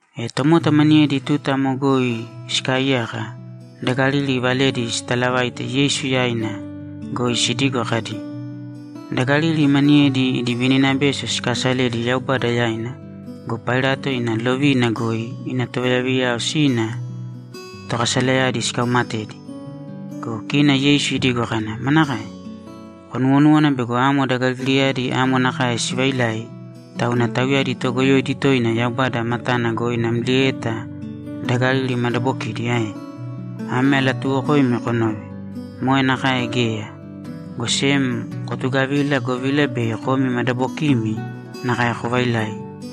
E tomota maniyedi tuta amo goi sikaaiyaka, da Galili valedi sitalavaite Yeisu yaina goi sidigo kadi, ‘Da Galili maniyedi idi vininabeso sikaasaledi Yaubada yaina go, Pailato ina lovina goi ina tovayaviyayao sina tokasalayadi sikaumatedi.’ Go kina Yeisu idigo kana, ‘Manakae? Konuwonúwana bego amo da Galiliyadi amo nakae sivailai, tauna tauyadi toogoyoidi toina Yaubada matana goi namlieta da Galili madabokidi ae? Ame alatuuwokoimi konōve: Moe nakae geya, go sem kotugavīla, govila bei komi madabokimi nakae kovailai.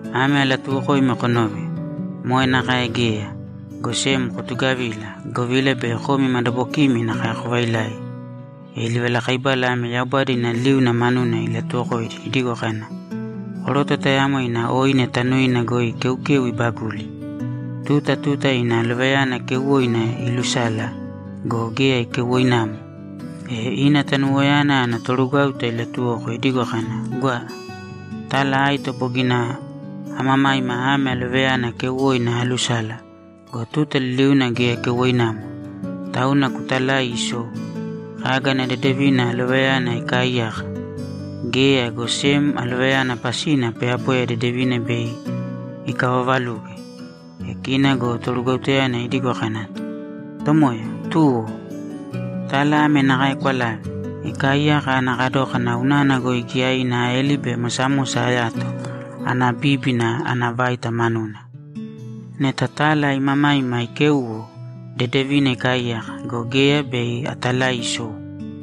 Ame alatuuwokoimi konōve: Moe nakae geya, go sem kotugavīla, govila bei komi madabokimi nakae kovailai.’ E livalakaibala ame Yaubada ina liuna manuna ilatuwokoidi idigo kana, ‘Koroto tayamo ina oine tanuina goi keukeu ibaguli. Tuta tuta ina alovayana keuwoina iilusala go, geya keuwoinamo. E ina tanuwoyana ana torugwáuta ilatuwoko idigo kana, “Gwa, tala aito bogina amamaima ame alovayana keuwoina aalusala go, tuta liliuna geya keuwoinamo. Tauna kutalāi isou. Kaga ana dedevina alovayana ikaaiyaka? Geya, go sem alovayana pasina poyapoya dedevina bei ikavavaluge.” E kina go torugwautayana idigo kana, “Tomoya, tuwo. Tala ame nakae kwalāve. Ikaaiyaka ana kadókana unana goi giyaina aeli be mosamosa ayato ana bíbina ana vaita manuna. Neta tala imamaima ikéuwo, dedevina ikaaiyaka, go geya, bei atalai isou.”’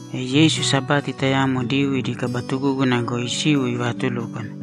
E Yeisu Sabati tayamo Diyuu idi kaba tugúguna goi isiu ivaatulúkwana.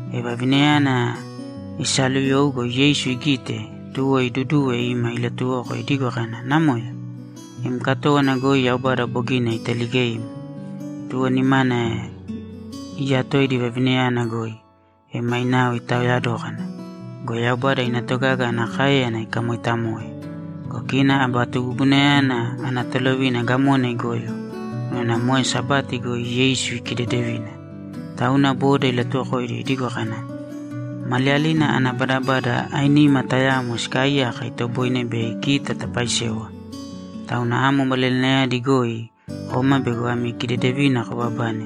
E vavinayana isaaluyou go, Yeisu igite, tuwo iduduwe ima ilatuwoko idigo kana, ‘Namoya, im katówana goi Yaubada bogina italigeim.’ Tuwo nimana iyatoidi vavinayana goi, e mainao itaoya dókana go, Yaubada ina togaga ana káeyana ikamoitamoe. Go kina aba tugugunayana ana tolovina gamona igoyo unana moe Sabati goi Yeisu ikidedevina. Tauna boda ilatuwokoidi idigo kana, ‘Maliyalina ana badabada ainima tayamo sikaaiyaka itoboine bei kita tapaaisewa. Tauna amo maliyalinayadi goi kōma bego ami kidedevina kobabane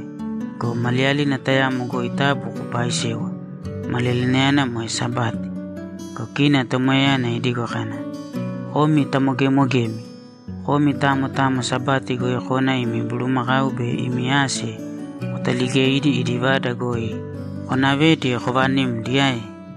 go, maliyalina tayamo goi taabu kopaaisēwa; maliyalinayana moe Sabati.’ Go kina Tomoyayana idigo kana, ‘Komi tamogemogemi! Komi tamo tamo Sabati goi kona imi bulumakau be imi ase kotaaligeidi idi vada goi konavedi kovanimdi ae?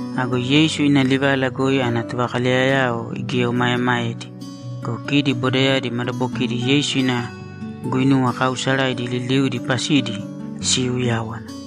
Ago Yeisu ina livala goi ana tovakaleyayao igieomaemaedi. Go kidi bodayadi madabokidi Yeisu ina guinuwa kaausaraidi liliudi pasidi siiuyáwana.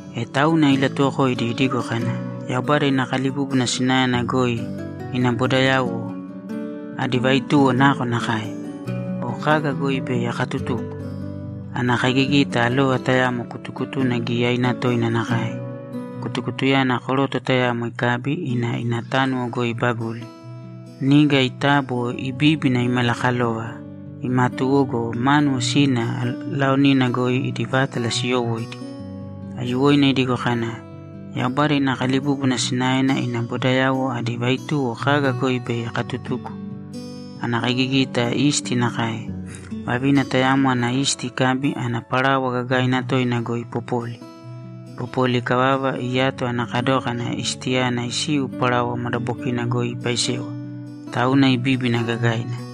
E tauna ilatuwokoidi idigo kana, ‘Yaubada ina kalibúbuna sinaena goi ina bodayauwo adi vaituwo nakonakae? O kaga goi bei akatutuko? Ana kaigigita alova tayamo kutukutuna giyaina toina nakae. Kutukutuyana koroto tayamo ikabi, ina ina tánuwo goi ibaguli. Niga itabo, ibíbina, imalakalova, imatuwo go, mánuwo sina laonina goi idi vátala siyowóidi.’ Aiyuwoina idigo kana, ‘Yaubada ina kalibúbuna sinaena ina bodayauwo adi vaituwo kaga goi bei akatutuko? Ana kaigigita isti nakae. Vavina tayamo ana isti ikabi, ana parawa gagaina toina goi ipopoli. Ipopoli ikavava, iyato ana kadókana istiyana isiu parawa madabokina goi ipaisewa, tauna ibíbina gagaina.’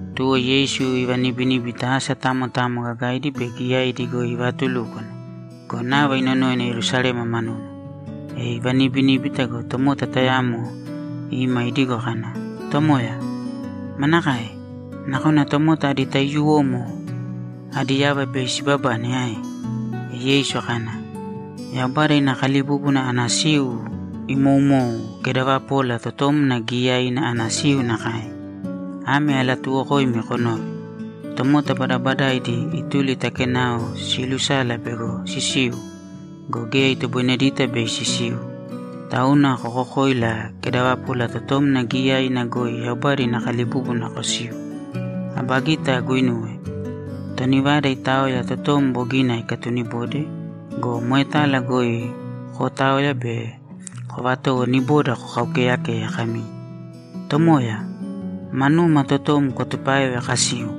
Tuwo Yeisu ivanibiníbita asa tamo tamo gagaidi be giyaidi goi ivaatulúkwana go, nava inonoina Yerusalema manuna. E ivanibiníbita go, tomota tayamo ima idigo kana, ‘Tomoya, manakae? Nakona tomota adi taiyuwomo adi yava bei sibabane ae?’ E Yeisu kana, ‘Yaubada ina kalibúbuna ana siu imoumou kedavapola totomna giyaiina ana siu nakae. Ame alatuuwokoimi konōve: Tomota badabadaidi ituli ta kenao siilusala bego sisiu go, geya itoboinedita bei sisiu. Tauna kokokōila kedavapola totomna giyaiina goi Yaubada ina kalibúbuna kosīu. Aba gita aguinuwe. Toni vada itaoya totom bogina ikatunibode go, moetala goi kootaoya be kovatowo niboda kokaukeyekeye kami, “Tomoya, manuma totom kwatupāeve kasiu!”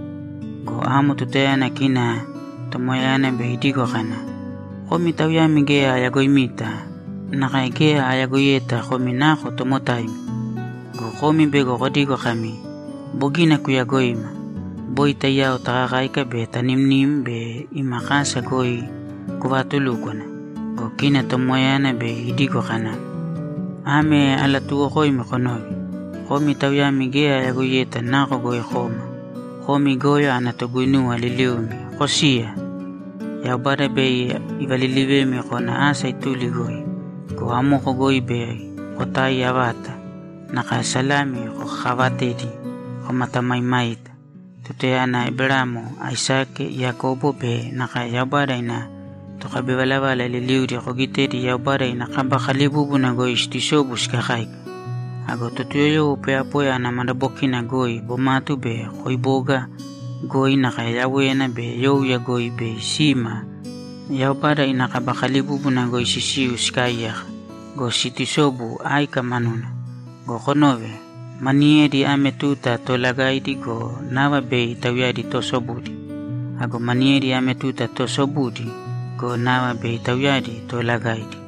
Go amo tutayana kina tomoyayana bei idigo kana, “Komi tauyami geya ayagoimita nakae geya ayagoiyeta komi nako tomotaimi.” Go komi bei kodigo kami, “Bogina kuyagoima. Boi taiyao takakáika be tanimnim be ima kasa goi kuvaatulúkwana!” Go kina tomoyayana bei idigo kana, “Ame alatuuwokoimi konōve: Komi tauyami geya ayagoiyeta nako goi koma. Komi goyo ana toguinuwa liliumi, kosīya!” Yaubada bei ivalilivemi kona asa ituli goi go, amoko goi bei kotaiya vata, nakae salami kokakaavatedi komatamaimaita tutayana Eberamo, Aisake, Yakobo be nakae Yaubada ina tokabivalavala liliudi kogitedi Yaubada ina kaba kalibúbuna goi siitusobu sikakáika. Ago Totuyoyowo poyapoya ana madabokina goi, bomatu be koiboga goi, nakae yawéyana be youya goi, bei sima Yaubada ina kaba kalibúbuna goi sisiu sikaaiyaka go, situsobu áika manuna. Go konōve. Maniyedi ame tuta toolagaidi go, nava bei tauyadi toosobudi. Ago maniyedi ame tuta toosobudi go, nava bei tauyadi toolagaidi.’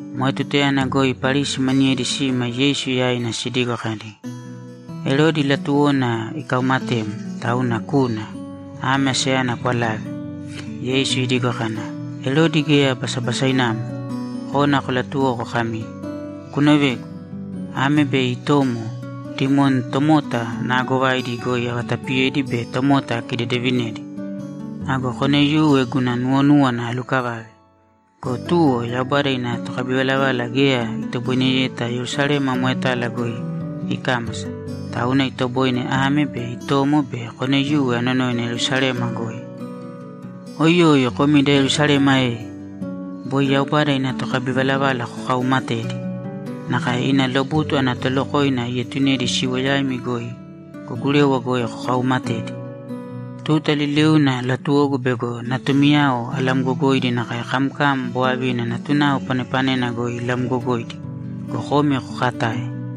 Moe tutayana goi Parisi maniyedi sima Yeisu yaina sidigo kadi, ‘Erodi latuwona ikaumatem, tauna kūna. Ame asayana kwalāve.’ Yeisu idigo kana, ‘Erodi geya basabasainamo. Kōna kolatuwōko kami, “Kunovēgu. Ame be itomo dimoni tomota naagovaidi goi avatapiyedi be tomota akidedevinedi. Ago koneiyuwe guna nuwonúwana alukavave.” Go tuwo, Yaubada ina tokabivalavala geya itoboineyeta Yerusalema moetala goi ikámasa, tauna itoboine ame be itomo be koneiyuwe anonoina Yerusalema goi. Oiyoi komi da Yerusalema e! Boi Yaubada ina tokabivalavala kokauumatedi. Nakae ina lobutu ana tolokoina ietunedi siwo yaimi goi go, gurewa goi kokaumatedi. Tuta liliuna latuwogu bego natumiyao alamgogoidi nakae kamkam bovavina natunao panepanena goi ilamgogoidi go, komi kokatae.